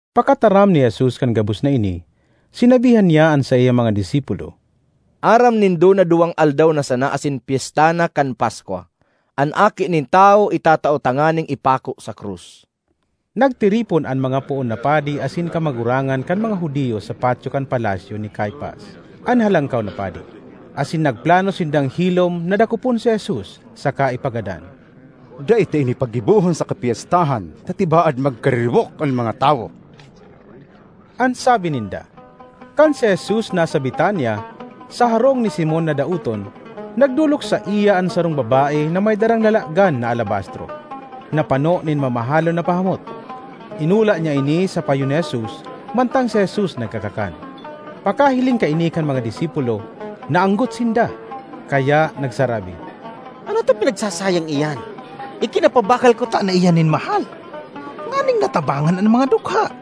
Pakataram ni Jesus kan gabos na ini, sinabihan niya an saiyang mga disipulo, ”Aram nindo na duwang aldaw na sana asin pyesta na kan Paskwa. An Aki nin Tawo itatao tanganing ipako sa krus.” Nagtiripon an mga poon na padi asin kamagurangan kan mga Judiyo sa patyo kan palasyo ni Caifas, an Halangkaw na Padi, asin nagplano sindang hilom na dakopon si Jesus saka ipagadan. ”Dai ta ini paggibohon sa kapyestahan ta tibaad magkariribok an mga tawo,” an sabi ninda. Kan si Jesus nasa Betania, sa harong ni Simon na daoton, nagdolok saiya an sarong babae na may darang lalagan na alabastro, na pano nin mamahalon na pahamot. Inula niya ini sa payo ni Jesus mantang si Jesus nagkakakan. Pakahiling kaini kan mga disipulo, naanggot sinda, kaya nagsarabi, “Ano ta pinagsasayang iyan? Ikinapabakal kutana iyan nin mahal nganing natabangan an mga dukha!”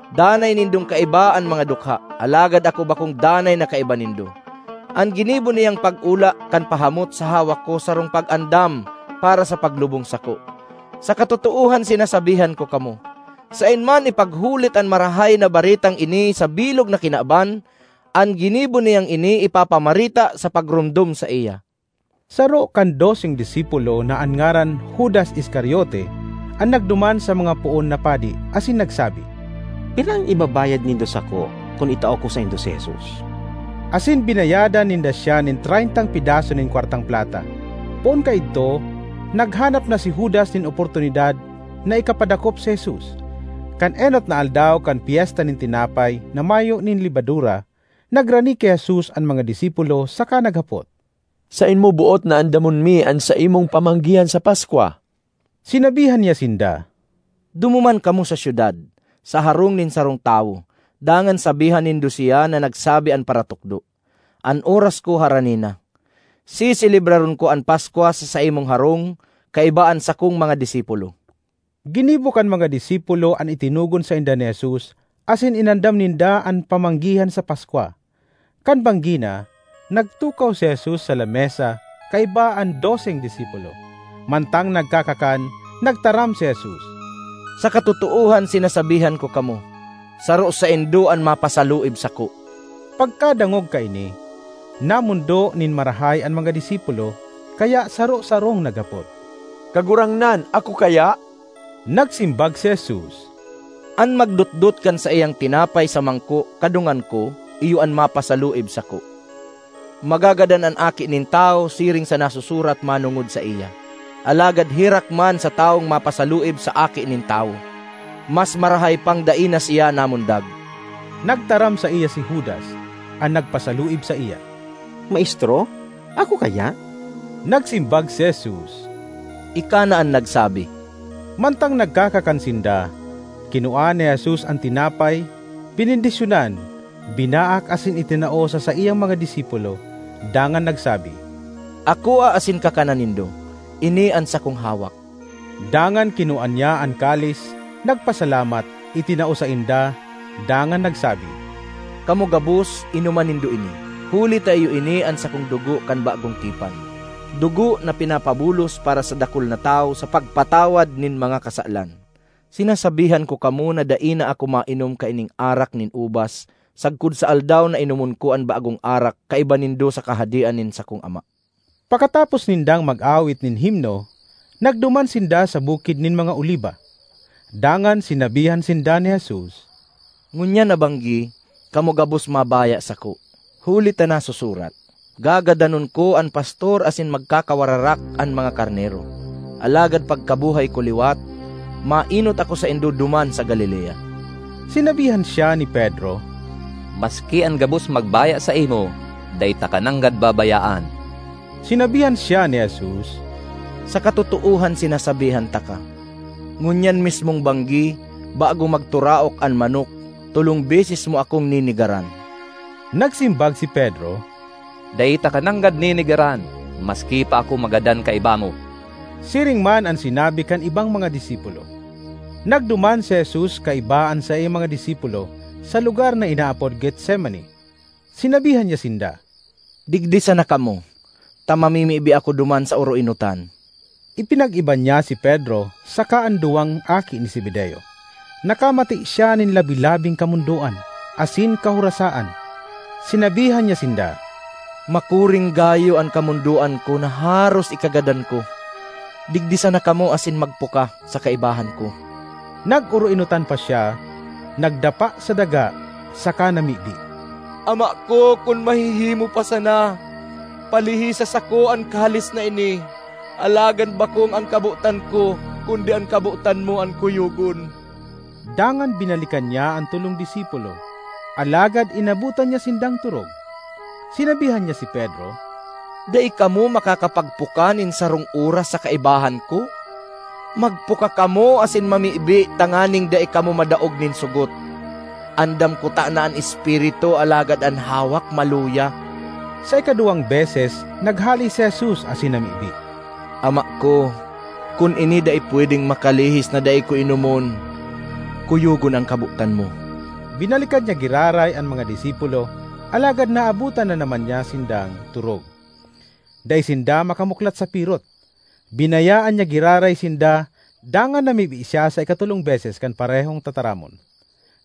Danay nindong kaiba an mga dukha, alagad ako bakong danay na kaiba nindo. An ginibo niyang pag-ula kan pahamot sa hawak ko sarong pag-andam para sa paglubong sako. Sa katotoohan sinasabihan ko kamo, saen man ipaghulit an Marahay na Baretang ini sa bilog na kinaban, an ginibo niyang ini ipapamareta sa pagromdom saiya.” Saro kan doseng disipulo, na an ngaran Judas Iscariote, an nagduman sa mga poon na padi asin nagsabi, “Pira an ibabayad nindo sako kun itao ko saindo si Jesus?” Asin binayadan ninda siya nin treyntang pedaso nin kwartang plata. Poon kaidto naghanap na si Judas nin oportunidad na ikapadakop si Jesus. Kan enot na aldaw kan Pyesta nin Tinapay na Mayo nin Lebadura, nagrani ki Jesus an mga disipulo saka naghapot, “Saen mo boot na andamon mi an saimong pamanggihan sa Paskwa?” Sinabihan niya sinda, “Dumuman kamo sa syudad, sa harong nin sarong tawo, dangan sabihan nindo siya na nagsabi an Paratukdo: ‘An oras ko harani na; seselebraron ko an Paskwa sa saimong harong kaiba an sakong mga disipulo.’” Ginibo kan mga disipulo an itinogon sainda ni Jesus asin inandam ninda an pamanggihan sa Paskwa. Kan banggi na, nagtukaw si Jesus sa lamesa kaiba an doseng disipulo. Mantang nagkakakan, nagtaram si Jesus, “Sa katotoohan sinasabihan ko kamo, saro saindo an mapasaluib sako.” Pagkadangog kaini, namondo nin marahay an mga disipulo kaya saro-sarong naghapot, “Kagurangnan, ako kaya?” Nagsimbag si Jesus, “An magdotdot kan saiyang tinapay sa mangko kadungan ko, iyo an mapasaluib sako. Magagadan an Aki nin Tawo siring sa nasusurat manongod saiya, alagad herak man sa tawong mapasaluib sa Aki nin Tawo! Mas marahay pang dai na siya namundag!” Nagtaram saiya si Judas, an nagpasaluib saiya, “Maestro, ako kaya?” Nagsimbag si Jesus, “Ika na an nagsabi.” Mantang nagkakakan sinda, kinua ni Jesus an tinapay, benendisyonan, binaak asin itinao sa saiyang mga disipulo, dangan nagsabi, “Akoa asin kakana nindo; ini an sakong hawak.” Dangan kinua niya an kalis, nagpasalamat, itinao sainda dangan nagsabi, “Kamo gabos, inoma nindo ini; huli ta iyo ini an sakong dugo kan bagong tipan, dugo na pinapabulos para sa dakul na tawo sa pagpatawad nin mga kasalan. Sinasabihan ko kamo na dai na ako mainom kaining arak nin ubas sagkod sa aldaw na inomon ko an bagong arak kaiba nindo sa Kahadean nin sakong Ama.” Pakatapos nindang mag-awit nin himno, nagduman sinda sa Bukid nin mga Oliba. Dangan sinabihan sinda ni Jesus, “Ngunyan na banggi, kamo gabos mabaya sako; huli ta nasusurat, ‘Gagadanon ko an pastor asin magkakawararak an mga karnero.’ Alagad pagkabuhay ko liwat, maenot ako saindo duman sa Galilea.” Sinabihan siya ni Pedro, “Maski an gabos magbaya saimo, dai taka nanggad babayaan.” Sinabihan siya ni Jesus, “Sa katotoohan sinasabihan taka, ngunyan mismong banggi, bago magturaok an manok, tolong beses mo akong nenegaran.” Nagsimbag si Pedro, “Dai taka nanggad nenegaran, maski pa ako magadan kaiba mo!” Siring man an sinabi kan ibang mga disipulo. Nagduman si Jesus kaiba an saiyang mga disipulo sa lugar na inaapod Getsemani. Sinabihan niya sinda, “Digdi sana kamo, ta mamimibi ako duman sa oroenotan.” Ipinag-iba niya si Pedro saka an duwang aki ni Zebedeo. Nakamate siya nin labi-labing kamondoan asin kahorasaan. Sinabihan niya sinda, “Makuring gayo an kamondoan ko na haros ikagadan ko! Digdi sana kamo asin magpuka sa kaibahan ko.” Nag-oroenotan pa siya, nagdapa sa daga saka namibi, “Ama ko, kun mahihimo pa sana, palihisa sako an kalis na ini! Alagad bakong an kabotan ko kundi an kabotan mo an kuyogon.” Dangan binalikan niya an tolong disipulo, alagad inabotan niya sindang torog. Sinabihan niya si Pedro, “Dai kamo makakapagpuka nin sarong oras sa kaibahan ko? Magpuka kamo asin mamibi tanganing dai kamo madaog nin sogot. Andam kutana an espiritu alagad an hawak maluya.” Sa ikaduwang beses naghale si Jesus asin namibi, “Ama ko, kun ini dai pwedeng makalihis na dai ko inomon, kuyogon an kabotan mo.” Binalikan niya giraray an mga disipulo alagad naabotan na naman niya sindang torog; dai sinda makamuklat sa pirot. Binayaan niya giraray sinda dangan namibi siya sa ikatolong beses kan parehong tataramon.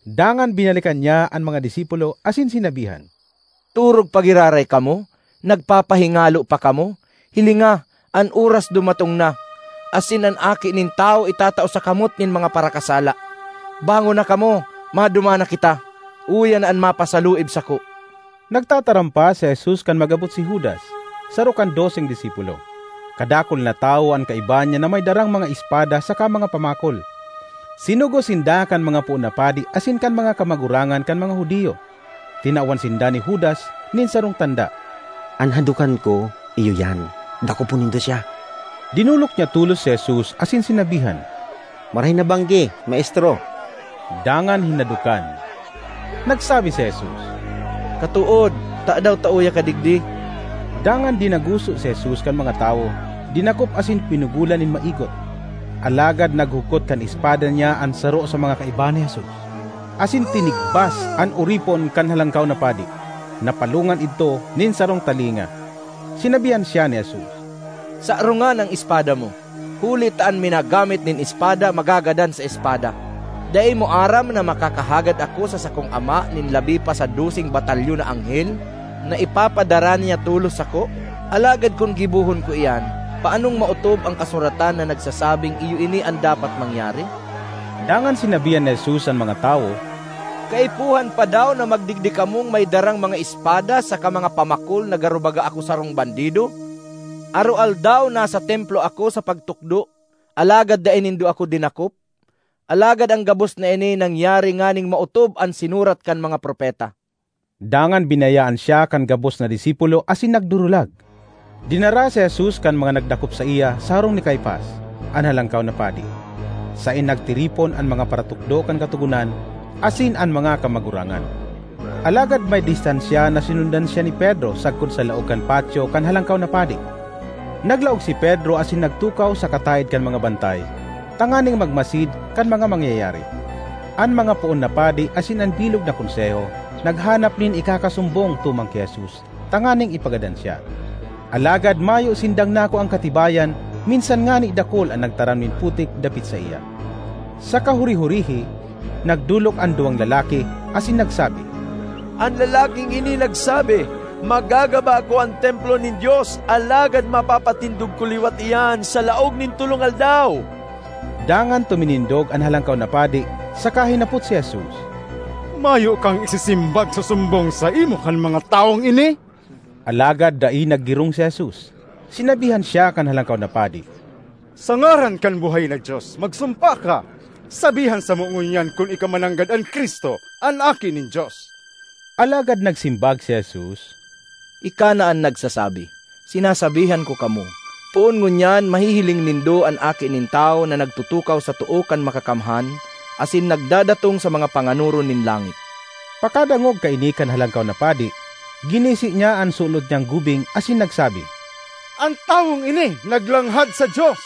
Dangan binalikan niya an mga disipulo asin sinabihan, “Torog pa giraray kamo? Nagpapahingalo pa kamo? Hilinga, an oras dumatong na, asin an Aki nin Tawo itatao sa kamot nin mga parakasala. Bangon na kamo, maduman na kita. Uya na an mapasaluib sako!” Nagtataram pa si Jesus kan mag-abot si Judas, saro kan doseng disipulo. Kadakul na tawo an kaiba niya na may darang mga espada saka mga pamakol. Sinugo sinda kan mga poon na padi asin kan mga kamagurangan kan mga Judio. Tinawan sinda ni Judas nin sarong tanda, “An hadokan ko iyo iyan. Dakopon nindo siya!” Dinolok niya tolos si Jesus asin sinabihan, “Marahay na banggi, Maestro!” dangan hinadokan. Nagsabi si Jesus, “Katood, tadaw ta uya ka digdi?” Dangan dinaguso si Jesus kan mga tawo, dinakop asin pinugolan nin maigot. Alagad naghugkot kan espada niya an saro sa mga kaiba ni Jesus, asin tinigbas an oripon kan Halangkaw na Padi; napalongan idto nin sarong talinga. Sinabihan siya ni Jesus, “Sarongan an espada mo, huli ta an minagamit nin espada, magagadan sa espada. Dai mo aram na makakahagad ako sa sakong Ama nin labi pa sa doseng batalyon na anghel na ipapadara niya tolos sako? Alagad kun gibohon ko iyan, paanong maotob an Kasuratan na nagsasabing iyo ini an dapat mangyari?” Dangan sinabihan ni Jesus an mga tawo, “Kaipuhan pa daw na magdigdi kamong may darang mga espada saka mga pamakol na garo baga ako sarong bandido? Aroaldaw nasa Templo ako sa pagtukdo, alagad dai nindo ako dinakop. Alagad an gabos na ini nangyari nganing maotob an sinurat kan mga propeta.” Dangan binayaan siya kan gabos na disipulo asin nagdurulag. Dinara si Jesus kan mga nagdakop saiya sa harong ni Caifas, an Halangkaw na Padi, saen nagtiripon an mga paratukdo kan Katogonan asin an mga kamagurangan. Alagad may distansya na sinundan siya ni Pedro sagkod sa laog kan patyo kan Halangkaw na Padi. Naglaog si Pedro asin nagtukaw sa kataed kan mga bantay tanganing magmasid kan mga mangyayari. An mga poon na padi asin an bilog na Konseho naghanap nin ikakasumbong tumang ki Jesus tanganing ipagadan siya. Alagad mayo sindang nakuang katibayan minsan ngani dakul an nagtaram nin putik dapit saiya. Sa kahuri-hurihi, nagdolok an duwang lalaki asin nagsabi, “An lalaking ini nagsabi, ‘Magagaba ko an Templo nin Dios alagad mapapatindog ko liwat iyan sa laog nin tolong aldaw.’” Dangan tuminindog an Halangkaw na Padi saka hinapot si Jesus, “Mayo kang isisimbag sa sumbong saimo kan mga tawong ini?” Alagad dai naggirong si Jesus. Sinabihan siya kan Halangkaw na Padi, “Sa ngaran kan buhay na Dios, magsumpa ka: sabihan samo ngunyan kun ika mananggad an Cristo, an Aki nin Dios.” Alagad nagsimbag si Jesus, “Ika na an nagsasabi. Sinasabihan ko kamo, poon ngunyan mahihiling nindo an Aki nin Tawo na nagtutukaw sa too kan Makakamhan asin nagdadatong sa mga panganoron nin langit!” Pakadangog kaini kan Halangkaw na Padi, ginisi niya an sulot niyang gubing asin nagsabi, “An tawong ini naglanghad sa Dios!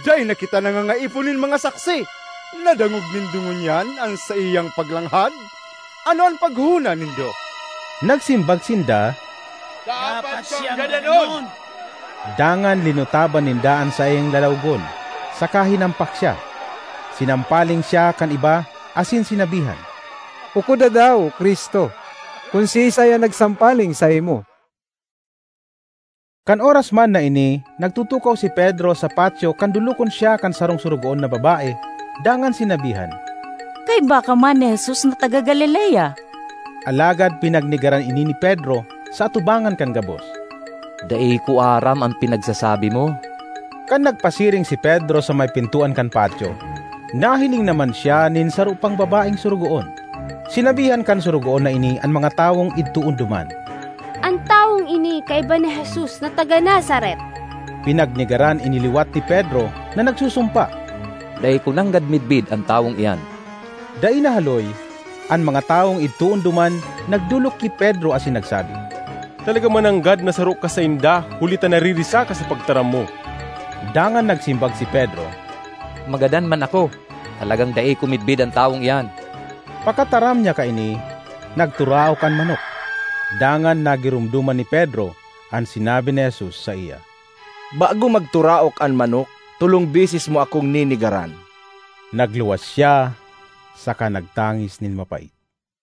Dai na kita nangangaipo nin mga saksi! Nadangog nindo ngunyan an saiyang paglanghad! Ano an paghona nindo?” Nagsimbag sinda, “Dapat siyang gadanon.” Dangan linutaban ninda an saiyang lalawogon saka hinampak siya. Sinampaling siya kan iba asin sinabihan, “Ukoda daw, Cristo, kun siisay an nagsampaling saimo!” Kan oras man na ini nagtutukaw si Pedro sa patyo kan dolokon siya kan sarong sorogoon na babae dangan sinabihan, “Kaiba ka man ni Jesus na taga Galilea.” Alagad pinagnegaran ini ni Pedro sa atubangan kan gabos, “Dai ko aram an pinagsasabi mo.” Kan nagpasiring si Pedro sa may pintoan kan patyo, nahiling naman siya nin saro pang babaeng sorogoon. Sinabihan kan sorogoon na ini an mga tawong idtoon duman, “An tawong ini kaiba ni Jesus na taga Nazaret.” Pinagnegaran ini liwat ni Pedro na nagsusumpa, “Dai ko nanggad midbid an tawong iyan!” Dai nahaloy, an mga tawong idtoon duman nagdolok ki Pedro asin nagsabi, “Talaga mananggad na saro ka sainda huli ta naririsa ka sa pagtaram mo!” Dangan nagsimbag si Pedro, “Magadan man ako, talagang dai ko midbid an tawong iyan!” Pakataram niya kaini, nagturaok an manok. Dangan nagiromdoman ni Pedro an sinabi ni Jesus saiya, “Bago magturaok an manok, tolong beses mo akong nenegaran.” Nagluwas siya saka nagtangis nin mapait.